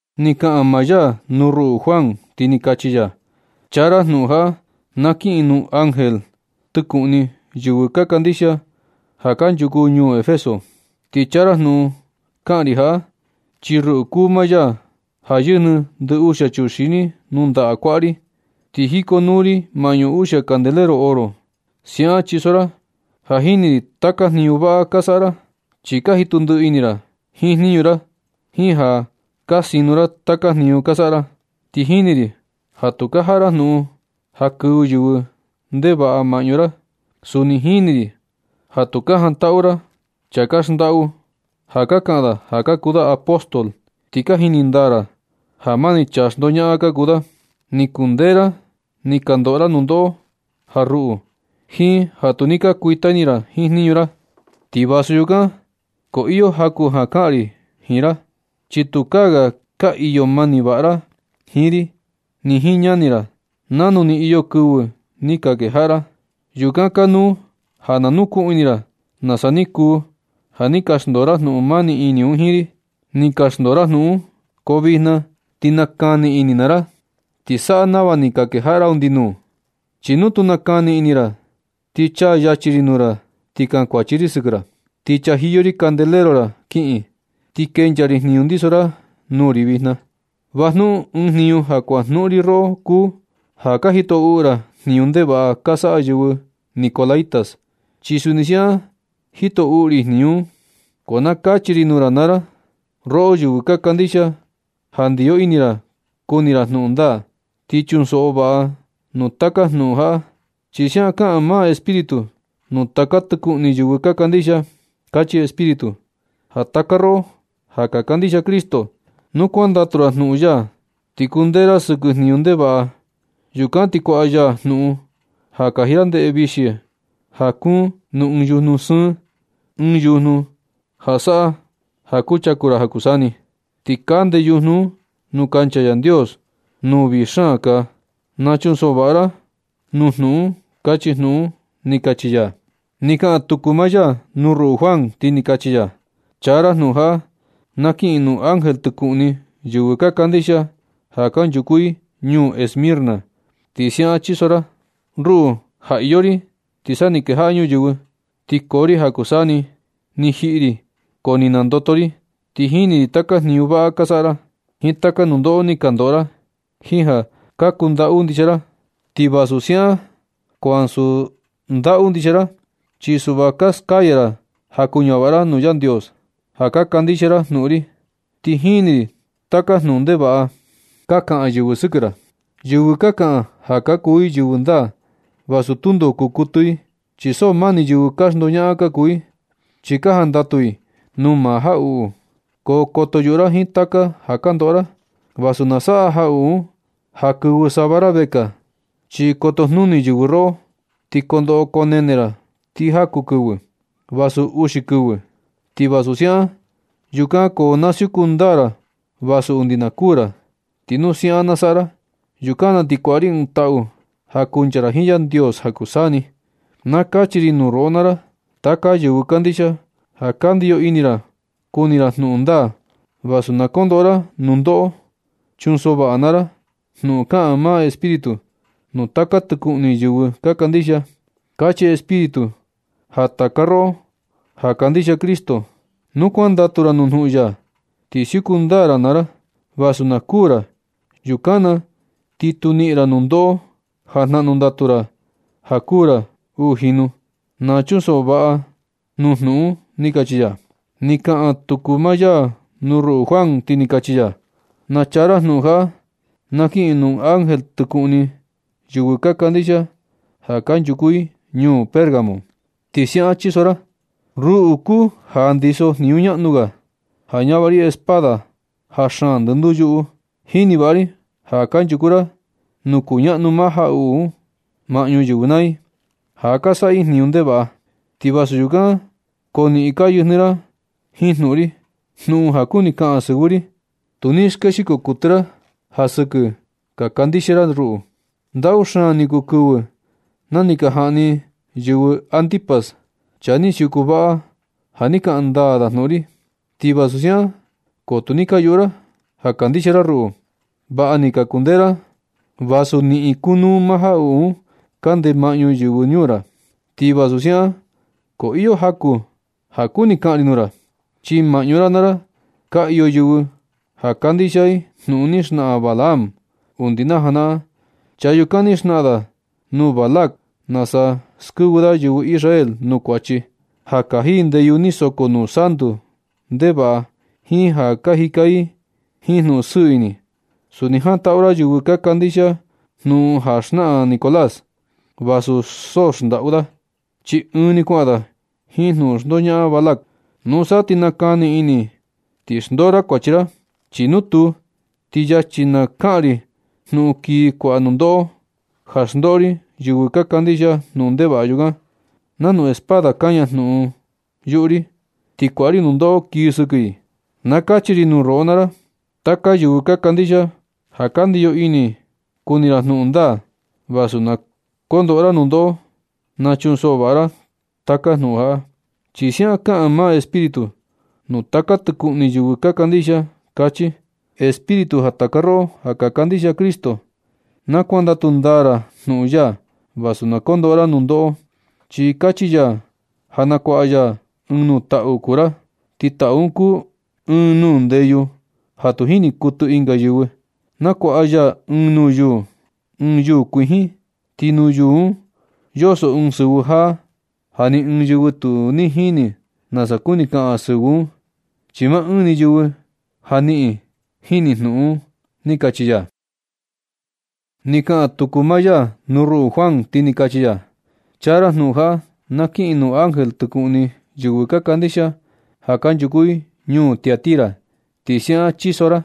Ni kaꞌan maa ya nuu ruꞌu Juan, ti ni kachi ya: ―Chaa ra jnuꞌun jaꞌa na kiꞌin nuu ángel tɨkuꞌni yɨvɨ kandixia ja kanchuku ñuu Efeso. Ti chaa ra jnuꞌun kaꞌan ri jaꞌa, chi ruꞌu kuu maa ya ja yɨjnɨ ndɨ uxia chuxini nuu ndaꞌa kuaꞌa ri, ti jikonuu ri maꞌñu uxia candelero oro. Siaꞌan chiso ra: “Ja jini ri taka jniñu vaꞌa ka saꞌa ra, chi ka jitu ndiꞌi ini ra jiin jniñu ra, jiin ja ka sino ra taka jniñu ka saꞌa ra. Ti jini ri ja tu ka jaꞌa ra jnuꞌun ja kɨvɨ yɨvɨ ndevaꞌa maꞌñu ra. Suni jini ri ja tu ka jantaꞌu ra chaa ka xndaꞌu ja ka kaꞌan da ja kuu da apóstol, ti ka jini ndaa ra ja mani chaa xndoñaꞌan ka kuu da. Ni kundee ra ni ka ndoꞌo ra nundoꞌo ja ruꞌu, jiin ja tu ni ka kuita ini ra jiin jniñu ra. Ti vasu yukan, ko iyo jaku ja kaꞌan ri jiin ra, chi tukaa ga ka iyo mani vaꞌa ra jiin ri ni jiin ñani ra nanu ni iyo kɨvɨ ni ka kejaꞌa ra. Yukan kanuu ja nukuꞌun ini ra nasa ni kuu ja ni ka xndoo ra jnuꞌun mani ini un jiin ri. Ni ka xndoo ra jnuꞌun un, ko vijna ti nakani ini naa ra ti saꞌa nava ni ka kejaꞌa ra undi nuu. Chi nu tu nakani ini ra, ti chaa yachi ri nuu ra ti kankuachi ri sɨkɨ ra, ti chajiyo ri candelero ra kiꞌin, ti kenchaa ri jniñu ndiso ra nuu ri vijna. Va jnuꞌun ɨɨn jniñu ja kuajnuꞌun ri roꞌo kuu ja ka jito uꞌu ra jniñu ndevaꞌa ka saꞌa yɨvɨ nicolaítas, chi suni siaꞌan jito uꞌu ri jniñu un. Ko na kachi ri nuu ra naa ra, roꞌo yɨvɨ ka kandixia ja ndiyo ini ra kuni ra jnuꞌun ndaa. Ti chunsoꞌo vaꞌa nuu taka jnuꞌun jaꞌa, chi siaꞌan kaꞌan maa Espíritu nuu taka tɨkuꞌni yɨvɨ ka kandixia. Kachi Espíritu ja taka roꞌo ja ka kandixia Cristo, nu kuandatu ndaa ra jnuꞌun ya ti kundee ra sɨkɨ jniñu ndevaꞌa, yukan ti kuaꞌa ya jnuꞌun ja kaji ra ndeꞌe vixi ja kuun nuu ɨɨn yujnu sɨɨn, ɨɨn yujnu ja saꞌa ja kuchaku ra ja kuu saa ni. Ti kande yujnu un nuu kancha Yandios nuu vii xaan kaa. Na chunsoꞌo vaꞌa ra nuu jnuꞌun un”, kachi jnuꞌun ―ni kachi ya. Ni kaꞌan tuku maa ya nuu ruꞌu Juan, ti ni kachi ya: ―Chaa ra jnuꞌun jaꞌa na kiꞌin nuu ángel tɨkuꞌni yɨvɨ ka kandixia ja kanchuku i ñuu Esmirna. Ti siaꞌan chiso ra: “Ruꞌu ja iyo ri ti sa ni kejaꞌa ñuyɨvɨ, ti koo ri ja kuu saa ni ni jiꞌi ri ko ni nandoto ri. Ti jini ri taka jniñu vaꞌa ka saꞌa ra, jiin taka nundoꞌo ni ka ndoꞌo ra, jiin ja ka kundaꞌu ndixia ra. Ti vasu siaꞌan ko ansu ndaꞌu ndixia ra, chi suꞌva ka naskaya ra ja kuñavaꞌa ra nuu Yandios ja ka kandixia ra jnuꞌun ri. Ti jini ri taka jnuꞌun ndevaꞌa ka kaꞌan yɨvɨ sɨkɨ ra, yɨvɨ ka kaꞌan ja ka kuu i yɨvɨ ndaa, vasu tundo kuu kuɨtɨ i, chi so mani yɨvɨ ka xndoñaꞌan ka kuu i, chi ka jandatu i nuu maa jaꞌuꞌu. Ko koto yuꞌu ra jiin taka ja kondoꞌo ra, vasu na saꞌa jaꞌuꞌu un ja kɨvɨ sava ra vekaa. Chi koto jnuni yɨvɨ roꞌo, ti koo ndoꞌo koo nene ra ti jaku kɨvɨ, vasu uxi kɨvɨ. Ti vasu siaꞌan, yukan ko na siuku ndaa ra vasu undi na kuū ra. Ti nu siaꞌan na saꞌa ra, yukan na ti kuaꞌa ri ɨɨn taꞌu ja kuchaku ra jiin Yandios ja kuu saa ni. Na kachi ri nuu roꞌo naa ra taka yɨvɨ kandixia, ja ka ndiyo ini ra kuni ra jnuꞌun ndaa, vasu na kondoꞌo ra nundoꞌo. Chunsoꞌo vaꞌa naa ra jnuꞌun kaꞌan maa Espíritu nuu taka tɨkuꞌni yɨvɨ ka kandixia. Kachi Espíritu ja taka roꞌo ja kandixia Cristo, nu kuandatu ra nuu jnuꞌun ya, ti siuku ndaa ra naa ra, vasu na kuū ra. Yukan na ti tu niꞌin ra nundoꞌo ja jnaꞌnu ndatu ra ja kuū ra uu jinu. Na chunsoꞌo vaꞌa ra nuu jnuꞌun un”, ―ni kachi ya. Ni kaꞌan tuku maa ya nuu ruꞌu Juan, ti ni kachi ya: ―Na chaa ra jnuꞌun jaꞌa na kiꞌin nuu ángel tɨkuꞌni yɨvɨ ka kandixia ja kanchuku i ñuu Pérgamo. Ti siaꞌan chiso ra: “Ruꞌu kuu ja ndiso jniñu ñaꞌnu ga, ja ñavaꞌa ri espada ja xaan ndɨnduu yuꞌu. Jini vaꞌa ri ja kanchuku ra nuu kuñaꞌnu maa jaꞌuꞌu un maꞌñu yɨvɨ naa i, ja ka saꞌa i jniñu ndevaꞌa. Ti vasu yukan ko niꞌin ka yɨjnɨ ra jiin jnuꞌun ri, jnuꞌun ja kuni kaꞌan sɨvɨ ri. Tu ni skexiko kuɨtɨ ra ja sɨkɨ ni ka kandixia ra ruꞌu. Ndaꞌu xaan ni kuu kɨvɨ na ni ka jaꞌni yɨvɨ Antipas, chaa ni siuku vaꞌa ja ni kaꞌan ndaa da jnuꞌun ri. Ti vasu siaꞌan ko tu ni ka yuꞌu ra ja kandixia ra ruꞌu. Vaꞌa ni ka kundee ra vasu niꞌin kunuu maa jaꞌuꞌu un kande maꞌñu yɨvɨ ñuu ra. Ti vasu siaꞌan ko iyo jaku ja kuni kaꞌan ri nuu ra. Chi maꞌñu ra naa ra ka iyo yɨvɨ ja kandixia i jnuꞌun ni xnaꞌan Balaam. Undi na janaꞌan chaa yukan ni xnaꞌan da nuu Balac nasa skɨvɨ da yɨvɨ Israel nuu kuachi, ja kaji i ndeyu ni soko nuu santu ndevaꞌa jiin ja ka jika i jiin jnuꞌun sɨɨ ini. Suni jantaꞌu ra yɨvɨ ka kandixia jnuꞌun ja xnaꞌan Nicolás, vasu so xndaꞌu da, chi ɨɨn ni kuaꞌan da jiin jnuꞌun xndoñaꞌan Balac. Nusa ti nakani ini ti xndoo ra kuachi ra. Chi nu tuu, ti yachi na kaꞌan ri jnuꞌun kii kuaꞌa nundoꞌo, ja xndoꞌo ri yɨvɨ ka kandixia jnuꞌun ndevaꞌa yukan. Nanu espada kaña jnuꞌun un yuꞌu ri, ti kuaꞌa ri nundoꞌo kii sɨkɨ i. Na kachi ri nuu roꞌo naa ra, taka yɨvɨ ka kandixia ja ka ndiyo ini ra kuni ra jnuꞌun ndaa, vasu na kondoꞌo ra nundoꞌo. Na chunsoꞌo vaꞌa ra nuu taka jnuꞌun jaꞌa, chi siaꞌan kaꞌan maa Espíritu nuu taka tɨkuꞌni yɨvɨ ka kandixia. Kachi Espíritu ja taka roꞌo ja ka kandixia Cristo, na kuandatu ndaa ra jnuꞌun ya, vasu na kondoꞌo ra nundoꞌo, chi kachi ya ja nakuaꞌa ya ɨɨn nuu taꞌu kuu ra, ti taꞌu un kuu ɨɨn nuu ndeyu ja tu jini kuɨtɨ ɨnga yɨvɨ. Nakuaꞌa ya ɨɨn nuu yuu, ɨɨn yuu kuijin, ti nuu yuu un yoso ɨɨn sɨvɨ jaa, ja ni ɨɨn yɨvɨ tu jini nasa kuni kaꞌan sɨvɨ un, chi maa ɨɨn ni yɨvɨ ja niꞌin”, jinu jnuꞌun ―ni kachi ya. Ni kaꞌan tuku maa ya nuu ruꞌu Juan, ti ni kachi ya: ―Chaa ra jnuꞌun jaꞌa na kiꞌin nuu ángel tɨkuꞌni yɨvɨ ka kandixia ja kanchuku i ñuu Tiatira. Ti siaꞌan chiso ra: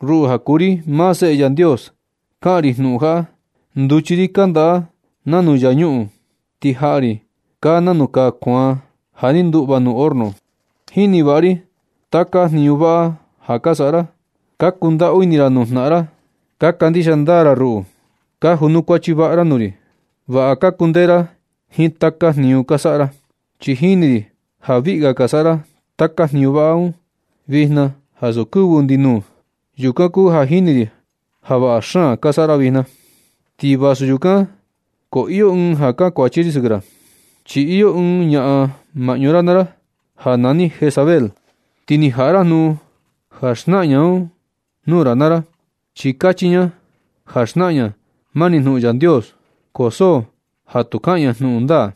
“Ruꞌu ja kuu ri maa Seꞌe Yandios, kaꞌan ri jnuꞌun jaꞌa. Nduchi ri kandaꞌa nanu yaa ñuꞌun. Ti jaꞌa ri kaa nanu kaa kuaan ja ni nduꞌva nuu horno. Jini vaꞌa ri taka jniñu vaꞌa ja ka saꞌa ra. Ka kundaꞌu ini ra nuu jnaꞌan ra. Kandixia ndaa ra ruꞌu. Ka junukuachi vaꞌa ra nuu ri. Vaꞌa ka kundee ra jiin taka jniñu ka saꞌa ra. Ti jini ri ja viꞌi ga ka saꞌa ra taka jniñu vaꞌa un vijna ansu kɨvɨ undi nuu. Yukan kuu ja jini ri ja vaꞌa xaan ka saꞌa ra vijna. Ti vasu yukan ko iyo ɨɨn ja kankuachi ri sɨkɨ ra. Chi iyo ɨɨn ñaꞌan maꞌñu ra naa ra ja nani Jezabel. Ti ni jaꞌa ra jnuꞌun ja xnaꞌan ña un nuu ra naa ra. Chi kachi ña ja xnaꞌan ña mani jnuꞌun Yandios. Ko so ja tu kaꞌan ña jnuꞌun ndaa,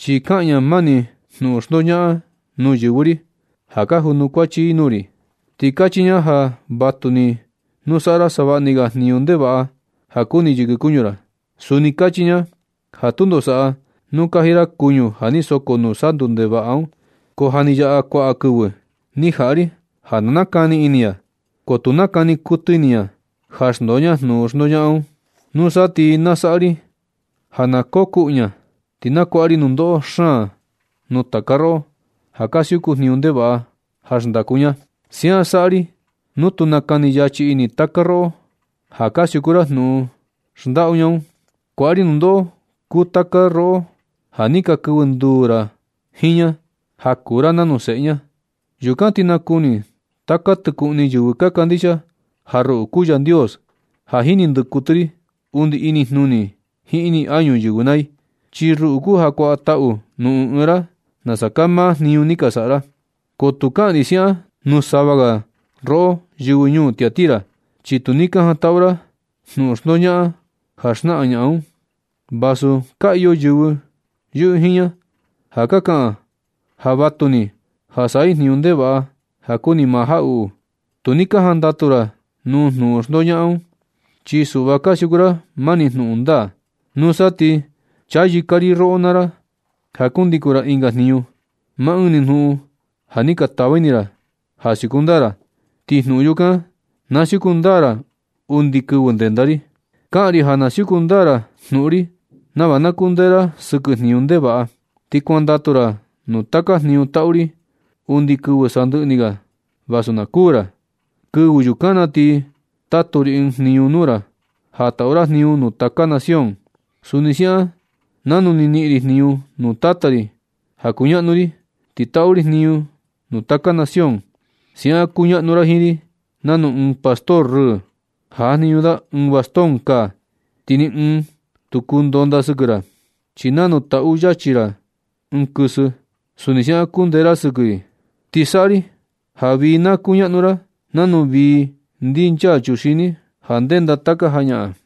chi kaꞌan ña mani jnuꞌun xndoñaꞌan nuu yɨvɨ ri ja ka junukuachi i nuu ri. Ti kachi ña ja vatuni nu saꞌa ra savaꞌni ga jniñu ndevaꞌa ja kuni yɨkɨ kuñu ra. Suni kachi ña ja tundo saꞌa nu kaji ra kuñu ja ni soko nuu santu ndevaꞌa un. Ko ja ni yaꞌa kuaꞌa kɨvɨ ni jaꞌa ri ja na nakani ini ña, ko tu nakani kuɨtɨ ini ña ja xndoo ña jnuꞌun xndoñaꞌan un. Nusa ti na saꞌa ri ja na kokuꞌu ña. Ti nakuaꞌa ri nundoꞌo xaan nuu taka roꞌo ja ka siuku jniñu ndevaꞌa ja xndaku ña. Siaꞌan saꞌa ri nu tu nakani yachi ini taka roꞌo ja ka siuku ra jnuꞌun xndaꞌu ña un. Kuaꞌa ri nundoꞌo kuu taka roꞌo ja ni ka kɨvɨ nduu jiin ña, ja kuu ra nanu seꞌe ña. Yukan ti nakuni taka tɨkuꞌni yɨvɨ ka kandixia ja ruꞌu kuu Yandios ja jini ndɨkuɨtɨ ri undi inijnuni jiin ini añu yɨvɨ naa i. Chi ruꞌu kuu ja kuaꞌa taꞌu nuu ɨɨn ɨɨn ra nasa kaa maa jniñu ni ka saꞌa ra. Ko tu kaꞌan ri siaꞌan nuu sava ga roꞌo yɨvɨ ñuu Tiatira, chi tu ni ka jantaꞌu ra jnuꞌun xndoñaꞌan ja xnaꞌan ñaꞌan un, vasu ka iyo yɨvɨ yɨꞌɨ jiin ña ja ka kaꞌan ja vatuni ja saꞌa i jniñu ndevaꞌa ja kuni maa jaꞌuꞌu. Tu ni ka jandatu ra nuu jnuꞌun xndoñaꞌan un. Chi suꞌva ka siuku ra mani jnuꞌun ndaa. Nusa ti tu chayɨka ri roꞌo naa ra ja kundikun ra ɨnga jniñu. Maa ɨɨn ni jnuꞌun ja ni ka tava ini ra ja siuku ndaa ra, ti jnuꞌun yukan na siuku ndaa ra undi kɨvɨ ndenda ri. Kaꞌan ri ja na siuku ndaa ra jnuꞌun ri nava na kundee ra sɨkɨ jniñu ndevaꞌa, ti kuandatu ra nuu taka jniñu taꞌu ri undi kɨvɨ sandɨꞌɨ ni ga, vasu na kuu ra. Kɨvɨ yukan na ti tatu ri ɨɨn jniñu nuu ra ja taꞌu ra jniñu nuu taka nación, Suni siaꞌan nanu ni niꞌin ri jniñu nuu Tata ri ja kuñaꞌnu ri, ti taꞌu ri jniñu nuu taka nación. Siaꞌan kuñaꞌnu ra jiin ri nanu ɨɨn pastor rɨɨ ja jajniñu da ɨɨn bastón kaa. Ti ni ɨɨn tu kuu ndonda sɨkɨ ra, chi nanu taꞌu yachi ra ɨɨn kɨsɨ, suni siaꞌan kundee ra sɨkɨ i. Ti saꞌa ri ja vii na kuñaꞌnu ra nanu vii ndinchaa chuxini ja ndenda taka jañaꞌan.